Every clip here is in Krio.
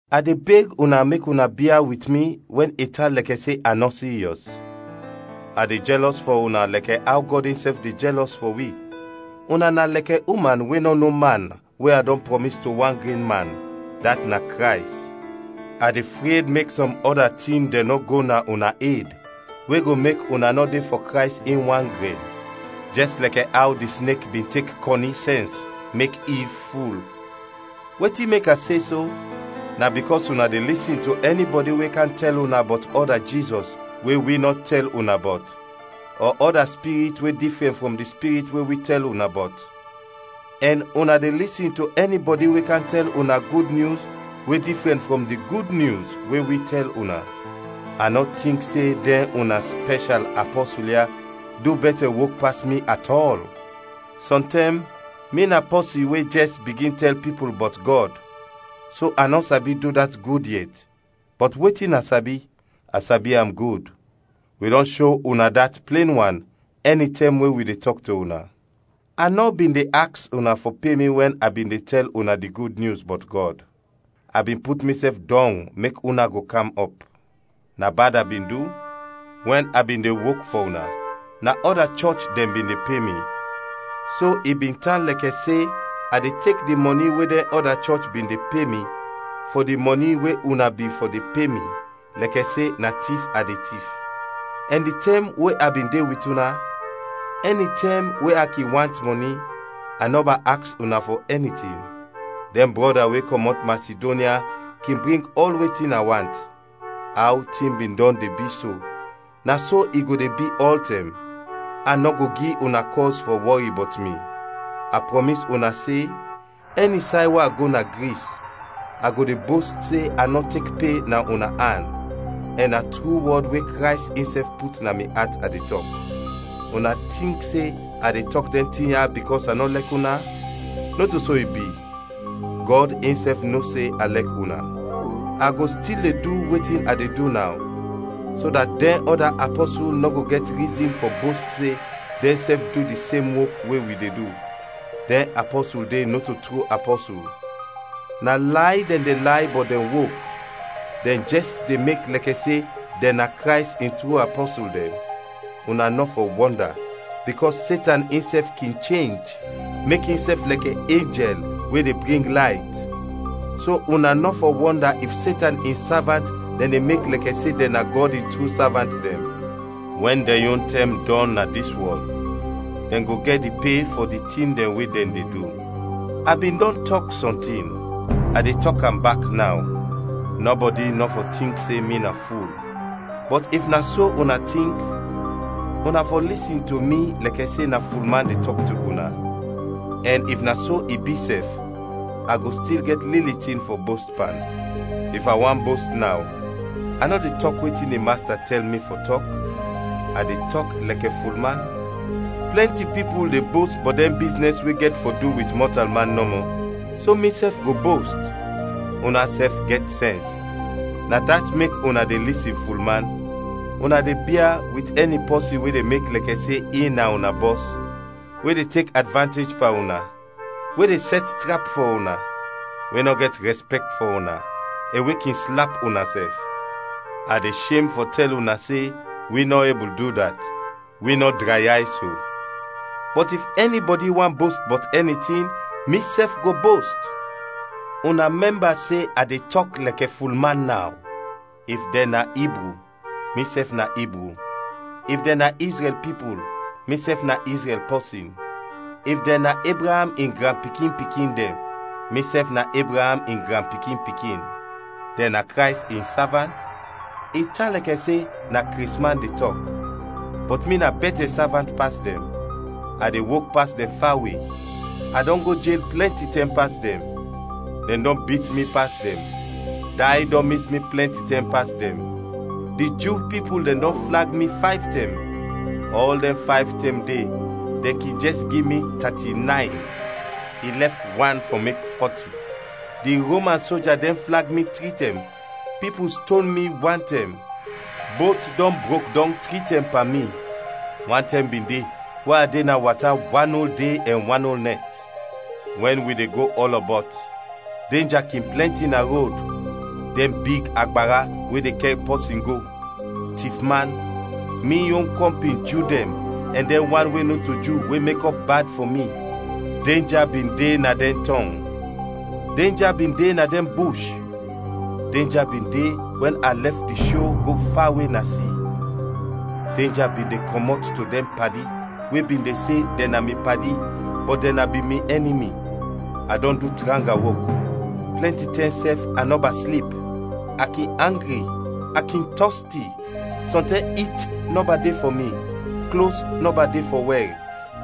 A de beg una mek una bia wit mi wɛn i tan lɛkɛ se a nɔ siryɔs. A de jɛlɔs fɔ una lɛkɛ aw Gɔd insɛf de jɛlɔs fɔ wi; una na lɛkɛ uman we nɔ no man we a dɔn prɔmis to wan gren man, dat na Krays. A de fred mek sɔm ɔda tin dɛn nɔ go na una ed we go mek una nɔ de fɔ Krays in wan gren, jɛs lɛkɛ aw di snek bin tek kɔni sɛns mek Iv ful. Wetin mek a se so, na bikɔs una de lisin to ɛnibɔdi we kam tɛl una bɔt ɔda Jizɔs we wi nɔ tɛl una bɔt, ɔ ɔda spirit we difrɛn frɔm di Spirit we wi tɛl una bɔt, ɛn una de lisin to ɛnibɔdi we kam tɛl una gud nyus we difrɛn frɔm di Gud Nyus we wi tɛl una. A nɔ tink se dɛn una spɛshal “apɔsul” ya du bɛtɛ wok pas mi atɔl! Sɔntɛm mi na pɔsin we jɛs bigin tɛl pipul bɔt Gɔd, so a nɔ sabi du dat gud yet, bɔt wetin a sabi, a sabi am gud. Wi dɔn sho una dat plen wan, ɛnitɛm we wi de tɔk to una. A nɔ bin de aks una fɔ pe mi wɛn a bin de tɛl una di Gud Nyus bɔt Gɔd; a bin put misɛf dɔng mek una go kam ɔp. Na bad a bin du? Wɛn a bin de wok fɔ una, na ɔda chɔch dɛn bin de pe mi. So i bin tan lɛkɛ se a de tek di mɔni we dɛn ɔda chɔch bin de pe mi, fɔ di mɔni we una bin fɔ de pe mi, lɛkɛ se na tif a de tif. Ɛn di tɛm we a bin de wit una, ɛnitɛm we a kin want mɔni, a nɔba aks una fɔ ɛni tin; dɛn brɔda we kɔmɔt Masidonya kin bring ɔl wetin a want. Aw tin bin dɔn de bi so, na so i go de bi ɔltɛm! A nɔ go gi una kɔz fɔ wɔri bɔt mi! A prɔmis una se, ɛni say we a go na Gris, a go de bost se a nɔ tek pe na una an, ɛn na tru wɔd we Krays insɛf put na mi at a de tɔk. Una tink se a de tɔk dɛn tin ya bikɔs a nɔ lɛk una? Nɔto so i bi. Gɔd insɛf no se a lɛk una! A go stil de du wetin a de du naw, so dat dɛn ɔda apɔsul nɔ go gɛt rizin fɔ bost se dɛnsɛf de du di sem wok we wi de du. Dɛn apɔsul de nɔto tru apɔsul; na lay dɛn de lay bɔt dɛn wok, dɛn jɛs de mek lɛkɛ se dɛn na Krays in tru apɔsul dɛn. Una nɔ fɔ wɔnda, bikɔs Setan insɛf kin chenj, mek insɛf lɛkɛ enjɛl we de bring layt. So una nɔ fɔ wɔnda if Setan in savant dɛn de mek lɛkɛ se dɛn na Gɔd in tru savant dɛn. Wɛn dɛn yon tɛm dɔn na dis wɔl, dɛn go gɛt di pe fɔ di tin dɛn we dɛn de du. A bin dɔn tɔk sɔntin, a de tɔk am bak naw: nɔbɔdi nɔ fɔ tink se mi na ful. Bɔt if na so una tink, una fɔ lisin to mi lɛkɛ se na fulman de tɔk to una, ɛn if na so i bi sɛf, a go stil gɛt lili tin fɔ bost pan. If a want bost naw, a nɔ de tɔk wetin di Masta tɛl mi fɔ tɔk, a de tɔk lɛkɛ fulman. Plɛnti pipul de bost bɔt dɛn biznɛs we gɛt fɔ du wit mɔtalman nɔmɔ, so misɛf go bost. Unasɛf gɛt sɛns, na dat mek una de lisin fulman! Una de bia wit ɛni pɔsin we de mek lɛkɛ se in na una bɔs, we de tek advantej pan una, we de sɛt trap fɔ una, we nɔ gɛt rɛspɛkt fɔ una, ɛn we kin slap una sɛf. A de shem fɔ tɛl una se wi nɔ ebul du dat, wi nɔ drayay so! Bɔt if ɛnibɔdi want bost bɔt ɛni tin, misɛf go bost; una mɛmba se a de tɔk lɛkɛ fulman naw. If dɛn na Ibru, misɛf na Ibru. If dɛn na Izrɛl pipul, misɛf na Izrɛl pɔsin. If dɛn na Ebraam in granpikin-pikin dɛn, misɛf na Ebraam in granpikin-pikin. Dɛn na Krays in savant? I tan lɛkɛ se na kresman de tɔk, bɔt mi na bɛtɛ savant pas dɛn! A de wok pas dɛn fawe, a dɔn go jel plɛnti tɛm pas dɛn, dɛn dɔn bit mi pas dɛn, day dɔn mis mi plɛnti tɛm pas dɛn. Di Ju pipul dɛn dɔn flag mi fayv tɛm; ɔl dɛn fayv tɛm de dɛn kin jɛs gi mi tati-nayn, i lɛf wan fɔ mek fɔti; di Roman soja dɛn flag mi tri tɛm, pipul ston mi wan tɛm; bot dɔn brok dɔng tri tɛm pan mi; wan tɛm bin de we a de na wata wanol de ɛn wanol nɛt. Wɛn wi de go ɔlɔbɔt, denja kin plɛnti na rod: dɛn big agbara we de kɛr pɔsin go, tifman, mi yon kɔmpin Ju dɛn ɛn dɛn wan we nɔto Ju we mekɔp bad fɔ mi; denja bin de na dɛn tɔng; denja bin de na dɛn bush; denja bin de wɛn a lɛf di sho go fawe na si; denja bin de kɔmɔt to dɛn padi we bin se dɛn na mi padi bɔt dɛn na bin mi ɛnimi. A dɔn du tranga wok; plɛnti tɛm sɛf a nɔba slip; a kin angri; a kin tɔsti; sɔntɛm it nɔba de fɔ mi; klos nɔba de fɔ wɛr;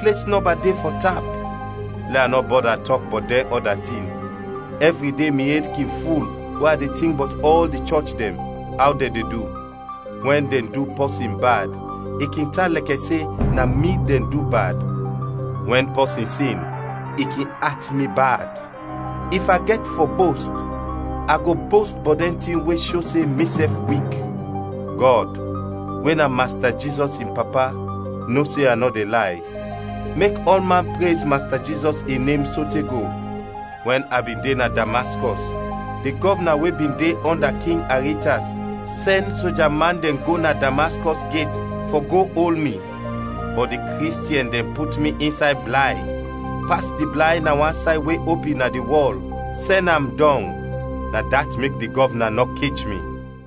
ples nɔba de fɔ tap. Lɛ a nɔ bɔda tɔk bɔt dɛn ɔda tin; ɛvri de mi ed kin ful we a de tink bɔt ɔl di chɔch dɛn, aw dɛn de du. Wɛn dɛn du pɔsin bad, i kin tan lɛkɛ se na mi dɛn du bad; wɛn pɔsin sin, i kin at mi bad. If a gɛt fɔ bost, a go bost bɔt dɛn tin we sho se misɛf wik. Gɔd, we na Masta Jizɔs in Papa, no se a nɔ de lay. Mek ɔlman prez Masta Jizɔs in nem sote go! Wɛn a bin de na Damaskɔs, di gɔvna we bin de ɔnda King Aritas sɛn soja man dɛn go na Damaskɔs gɛt fɔ go ol mi. Bɔt di Kristiɛn dɛn put mi insay blay, pas di blay na wan say we opin na di wɔl, sɛn am dɔng; na dat mek di gɔvna nɔ kech mi.